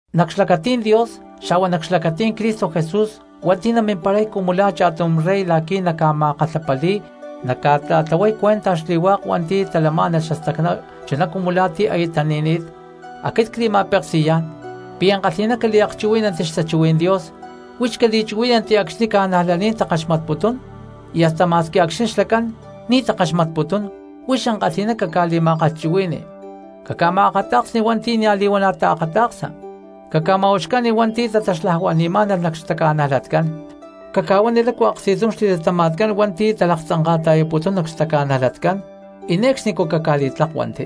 Nac xlacatí̠n Dios xa̠hua nac xlacatí̠n Cristo Jesús hua̠nti̠ namimparay cumu la̠ cha̠tum rey la̠qui̠ naca̠ma̠kalhapali̠y naca̠ta̠tlahuay cuenta xli̠hua̠k hua̠nti̠ talamá̠nalh xastacná chuná cumu la̠ ti̠ aya tani̠ni̠t, aquit cli̠ma̠peksi̠yá̠n pi̠ ankalhi̠ná caliakchuhuí̠nanti xtachuhuí̠n Dios, huix cali̠chuhuí̠nanti acxni̠ cristianos takaxmatputún y asta ma̠squi acxni̠ xlacán ni̠ takaxmatputún huix ankalhi̠ná caca̠li̠ma̠kalhchuhui̠ni. Caca̠ma̠akata̠ksni hua̠nti̠ nia̠ li̠huana̠ taakata̠ksa, caca̠ma̠uxca̠ni hua̠nti̠ tataxlajuani̠má̠nalh nac xtaca̠najlatcán, caca̠huani lácu aksti̠tum xli̠latama̠tcán hua̠nti̠ talaktzanka̠ta̠yaputún nac xtaca̠najlatcán, y ne̠cxnicú caca̠li̠tlakuanti.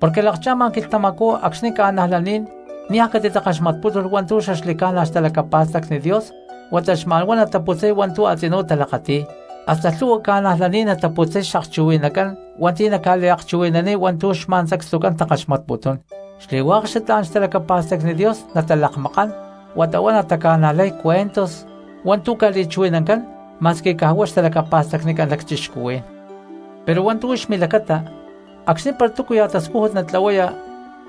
Porque lakcha̠ma quilhtamacú acxni̠ cristianos niaj catitakaxmatpútulh hua̠ntu̠ xaxli̠ca̠na xtalacapa̠stacni Dios huata xma̠n huá nataputzay hua̠ntu̠ a̠tzinú talakati̠y, hasta lhu̠hua cristianos nataputzay xakchuhui̠nacán hua̠nti̠ naca̠liakchuhui̠naniy hua̠ntu̠ xma̠n sacstucán takaxmatputún. Xli̠hua̠k xatlá̠n xtalacapa̠stacni Dios natalakmakán huata huá nataca̠najlay cuentos hua̠ntu̠ ca̠li̠chuhui̠nancán ma̠squi caj hua̠k xtalacapa̠stacnicán cristianos. Pero hua̠ntu̠ huix milacata, acxni̠ para túcuya̠ tascújut natlahuaya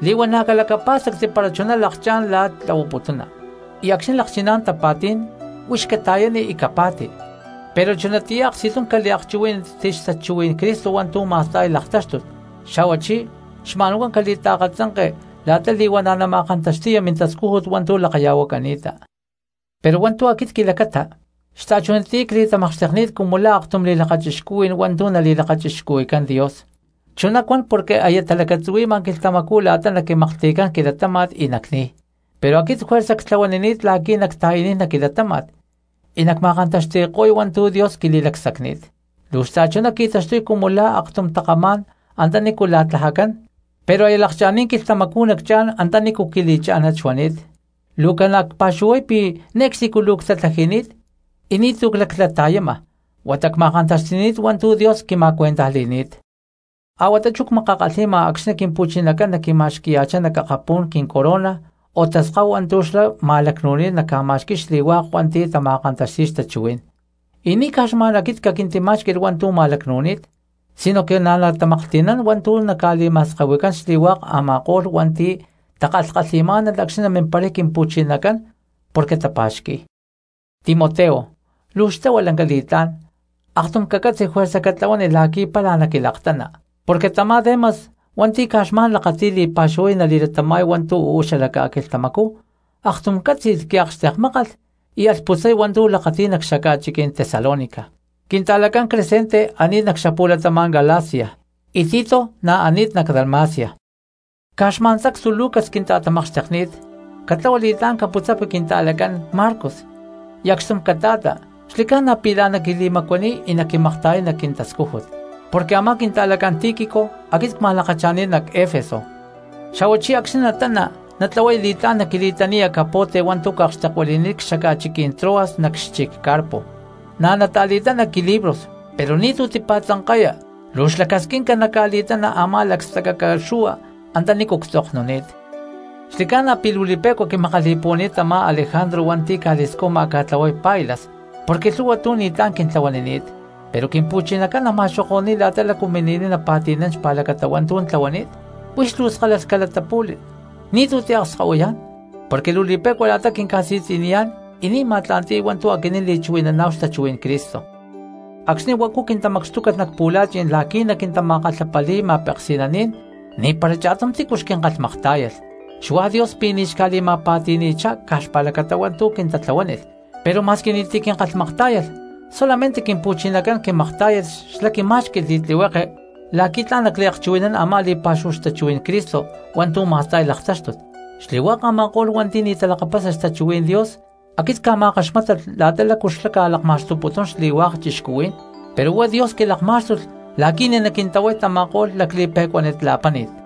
li̠huana̠ calacapá̠stacti para chuná lakchá̠n la̠ tlahuaputuna, y acxni̠ lakchiná̠n tapa̠tí̠n huix cata̠yani y capa̠ti, pero chunatiyá aksti̠tum caliakchuhuí̠nanti xtachuhuí̠n Cristo hua̠ntu̠ ma̠sta̠y laktáxtut, xa̠huachí xma̠n huá cali̠taakatzanke la̠ta li̠huana̠ nama̠kantaxti̠ya mintascújut hua̠ntu̠ lakaya̠huacani̠ta. Pero hua̠ntu̠ aquit quilacata, xta̠chunatiyá cli̠tamakxtekni̠t cumu la̠ aktum li̠lakachixcuhui̠n hua̠ntu̠ nali̠lakachixcuhui̠cán Dios, chuná cuan porque aya talacatzuhui̠ma quilhtamacú la̠ta naquimaklhti̠cán quilatáma̠t y nacni̠y. Pero aquit juerza ctlahuanini̠t la̠qui̠ nacta̠yaniy nac quilatáma̠t y nacma̠kantaxti̠ko̠y hua̠ntu̠ Dios quili̠lacsacni̠t, luu xta̠chuná qui̠taxtuy cumu la̠ aktum takamá̠n antanícu la̠tlajacán, pero aya lakcha̠ni̠t quilhtamacú nacchá̠n antanícu quili̠chá̠nat xuani̠t, luu ca̠na cpa̠xuhuay pi̠ ne̠cxnicú luu ctatlaji̠ni̠t y ni̠tu̠ claclata̠yama huata cma̠kantaxti̠ni̠t hua̠ntu̠ Dios quima̠cuentajli̠ni̠t. Ahuatá chú cmakakalhi̠ma acxni̠ Quimpu̠chinacán naquima̠xqui̠yá̠chá nac akapú̠n quincorona o taskáhu hua̠ntu̠ xlá ma̠lacnu̠ni̠t naca̠ma̠xqui̠y xli̠hua̠k hua̠nti̠ tama̠kantaxti̠y xtachuhuí̠n. Y ni̠ caj xma̠n aquit caquintimá̠xqui̠lh hua̠ntu̠ ma̠lacnu̠ni̠t, sinoque na̠ natamaklhti̠nán hua̠ntu̠ naca̠li̠ma̠skahui̠cán xli̠hua̠k a̠ma̠ko̠lh hua̠nti̠ takalhkalhi̠má̠nalh acxni̠ namimparay Quimpu̠chinacán porque tapa̠xqui̠y. Timoteo, luu xtlahua lanca li̠tlá̠n, aktum cacatzi juerza catlahuani la̠qui̠ pála naquilaktana, porque tamá Demas hua̠nti̠ caj xma̠n lakati̠y li̠pa̠xúhu nali̠latama̠y hua̠ntu̠ uú xala ca̠quilhtamacú aktum cátzi̠lh quiakxtekmákalh y alh putzay hua̠ntu̠ lakati̠y nac xaca̠chiquí̠n Tesalónica; quinta̠lacán Crescente ani̠t nac xapu̠latama̠n Galicia, y Tito na̠ ani̠t nac Dalmacia. Caj xma̠n sacstu Lucas quinta̠tamakxtekni̠t. Catlahua li̠tlá̠n caputzapi quinta̠lacán Marcos y acxtum cata̠ta porque xli̠ca̠na pi̠ la̠n naquili̠macuaniy y naquimakta̠yay nac quintascújut. Porque a̠má quinta̠lacán Tíquico aquit cma̠lakacha̠ni̠t nac Efeso. Xa̠huachí acxni̠ natana natlahuaya li̠tlá̠n naquili̠taniya capote hua̠ntu̠ cakxtekuili̠ni̠t cxaca̠chiquí̠n Troas nac xchic Carpo; na̠ nata̠li̠tana quilibros, pero ni̠tu̠ tipa̠tzanka̠ya luu xlacasquinca naca̠li̠tana a̠má lacstacaca xu̠hua antanícu ctzoknuni̠t. Xli̠ca̠na pi̠ luu li̠pe̠cua quimakali̠puhuani̠t tamá Alejandro hua̠nti̠ ca̠li̠scuja ca̠tlahuay pailas, porque lhu̠hua tu̠ ni̠tlá̠n quintlahuanini̠t. Pero Quimpu̠chinacán nama̠xoko̠ni̠y la̠ta lácu mini̠niy napa̠ti̠nán xpa̠lacata hua̠ntu̠ tlahuani̠t. Huix luu skalalh calatapu̠li ni̠tu̠ tiakskahuiyá̠n, porque luu li̠pe̠cua la̠ta quinca̠si̠tzi̠niyá̠n y ni̠ ma̠tla̠nti̠y hua̠ntu̠ aquinín li̠chuhui̠naná̠hu xtachuhuí̠n Cristo. Acxni̠ huacu quintamacxtúcalh nac pu̠la̠chi̠n la̠qui̠ naquintama̠kalhapali̠y ma̠peksi̠naní̠n ni̠para cha̠tum tícu xquinkalhmaktá̠yalh. Xuá Dios pi̠ ni̠ xca̠li̠ma̠pa̠ti̠ni̠chá̠n caj xpa̠lacata hua̠ntu̠ quintatlahuánilh. Pero ma̠squi ni̠ti̠ quinkalhmaktá̠yalh solamente Quimpu̠chinacán quimaktá̠yalh xlá quimá̠xqui̠lh li̠tlihueke la̠qui̠ tla̠n nacliakchuhui̠nán a̠má li̠pa̠xúhu xtachuhuí̠n Cristo hua̠ntu̠ ma̠sta̠y laktáxtut, y xli̠hua̠k a̠ma̠ko̠lh hua̠nti̠ ni̠ talakapasa xtachuhuí̠n Dios aquit cca̠ma̠kaxmátalh la̠ta la̠cu xlá ca̠lakma̠xtuputún xli̠hua̠k cristianos. Pero huá Dios quilakmá̠xtulh la̠qui̠ ni̠ naquintahuay tama̠ko̠lh lacli̠pe̠cuánit la̠páni̠t,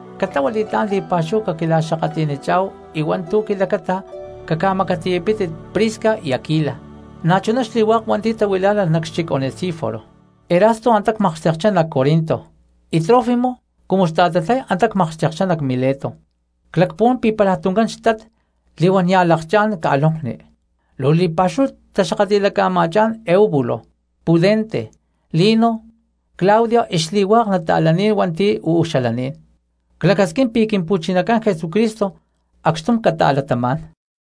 Catlahua li̠tlá̠n li̠pa̠xúhu caquila̠xakatli̠nichá̠hu y hua̠ntu̠ quilacata caca̠macatiyapítit Prisca y Aquila, na̠chuná xli̠hua̠k hua̠nti̠ tahuilá̠nalh nac xchic Onesíforo. Erasto antá tamakxtekchá nac Corinto, y Trófimo cumu xta̠tatlay antá cmakxtekchá nac Mileto. Clacpuhuán pi̠ pálaj tuncán xtat li̠huán nia̠ lakchá̠n ca̠lonkni. Luu li̠pa̠xúhu taxakatli̠laca̠ma̠chá̠n Eubulo, Pudente, Lino, Claudia y xli̠hua̠k nata̠laní̠n hua̠nti̠ uú xalaní̠n. Clacasquín pi̠ Quimpu̠chinacán Jesucristo acxtum cata̠latamá̠n.